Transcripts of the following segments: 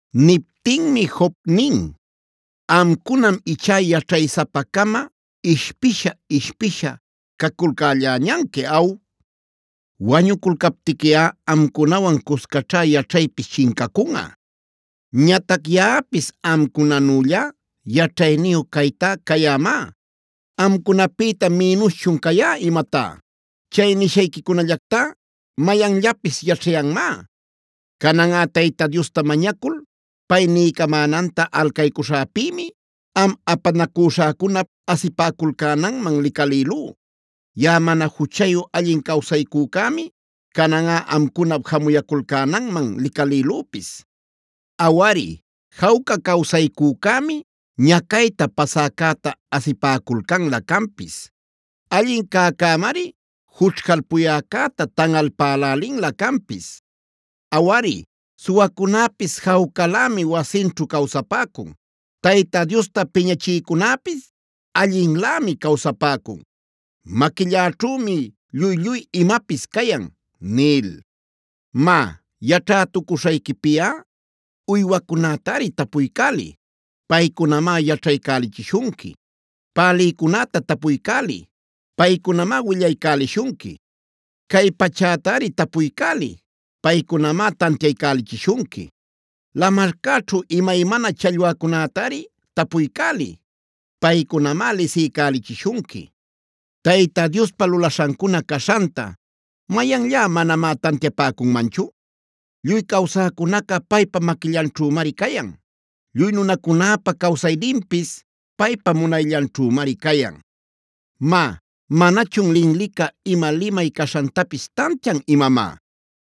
Niptinmi Job nin: “Amcunam ichá yaćhaysapa-cama ishpisha-ishpisha, caculcälläñanqui ¿aw? Wañuculcaptiquiꞌa amcunawan cuscaćhá yaćhaypis chincacunꞌa. Ñatac yaꞌapis amcunanüllá yaćhayniyu caytá cayämá. ¿Amcunapïta minuschun cayá imatá? Chay nishayquicunallactá mayanllapis yaćhayanmá. Cananꞌa Tayta Diosta mañacul pay niycamänanta alcaycuśhäpïmi, am apanacüśhäcunap asipäculcänanman licalïlú. Yaꞌa mana juchayu allin cawsaycücämi, cananꞌa amcunap jamuyäculcänanman licalïlüpis. Awari, jawca cawsaycücämi ñacayta pasäcäta asipäculcanlä canpis. Allin cäcämari jućhcalpuyäcäta tanꞌalpälälinlä canpis. Awari, suwacunäpis jawcalämi wasinćhu cawsapäcun. Tayta Diosta piñachïcunäpis allinlämi cawsapäcun: ‘Maquilläćhümi lluy-lluy imapis cayan’ nil. “Má, yaćhätucuśhayquipiꞌa uywacunätari tapuycäliy, paycunamá yaćhaycälichishunqui. Pälïcunäta tapuycäliy, paycunamá willaycälishunqui. Cay pachätari tapuycäliy, paycunamá tantiaycälichishunqui. Lamarcäćhu imaymana challwacunätari tapuycäliy, paycunamá lisiycälichishunqui. Tayta Diospa lulaśhancuna caśhanta, ¿mayanllá manamá tantiapäcunmanchu? Lluy cawsäcunaca paypa maquillanćhümari cayan. Lluy nunacunäpa cawsayninpis paypa munayllanćhümari cayan. “Má, ¿manachun linlica ima limay caśhantapis tantian imamá?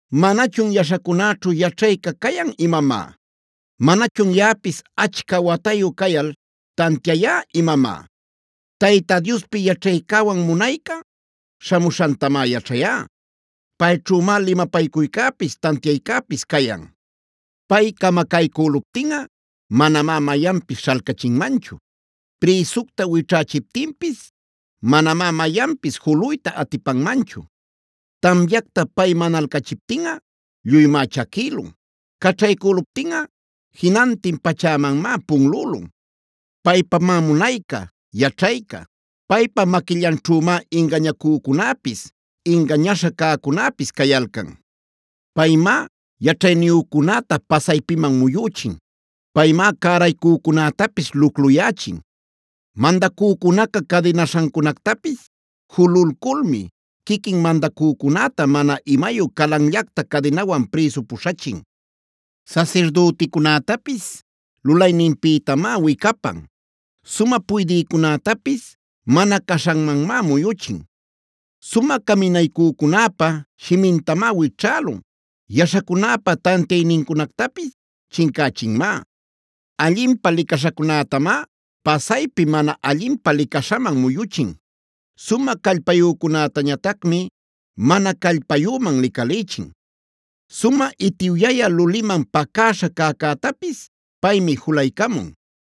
¿Manachun yaśhacunäćhu yaćhayca cayan imamá? ¿Manachun yaꞌapis achca watayu cayal tantiayá imamá? Tayta Diospi yaćhaycäwan munayca śhamuśhantamá yaćhayá. Payćhümá limapaycuycäpis, tantiaycäpis cayan. Pay camacaycüluptinꞌa manamá mayanpis śhalcachinmanchu. Prïsucta wićhächiptinpis manamá mayanpis juluyta atipanmanchu. Tamyacta pay manalcächiptinꞌa lluymá chaquïlun. Caćhaycüluptinꞌa jinantin pachämanmá punlülun. Paypamá munayca, yaćhayca. Paypa maquillanćhümá ingañacücunäpis, ingañäśha cäcunäpis cayalcan. Paymá yaćhayniyücunäta pasaypiman muyüchin. Paymá cäraycücunätapis lucluyächin. Mandacücunaca cadinaśhancunactapis jululculmi, quiquin mandacücunäta mana imayu calanllacta cadinawan prïsu puśhachin. Sasirdüticunätapis lulayninpïtamá wicapan. Sumä puydïcunätapis mana caśhanmanmá muyuchin. Sumä caminaycücunäpa shimintamá wićhälun. Yaśhacunäpa tantiaynincunactapis chincächinmá. Allinpä licaśhacunätamá pasaypi mana allinpä licaśhaman muyuchin. Sumä callpayücunätañatacmi mana callpayüman licalïchin. “Sumä itiwyaya luliman pacäśha cäcätapis paymi julaycamun.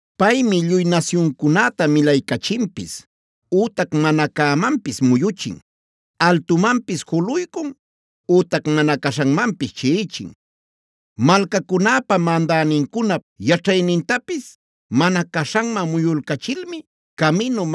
Paymi lluy nasyuncunäta milaycachinpis ütac mana cämanpis muyuchin; altumanpis juluycun ütac mana caśhanmanpis chiꞌichin. Malcacunäpa mandänincunap yaćhaynintapis, mana caśhanman muyulcachilmi caminu,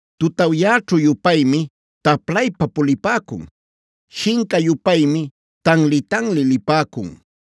Tutawyäćhu-yupaymi taplaypa pulipäcun; shinca-yupaymi tanli-tanli lipäcun.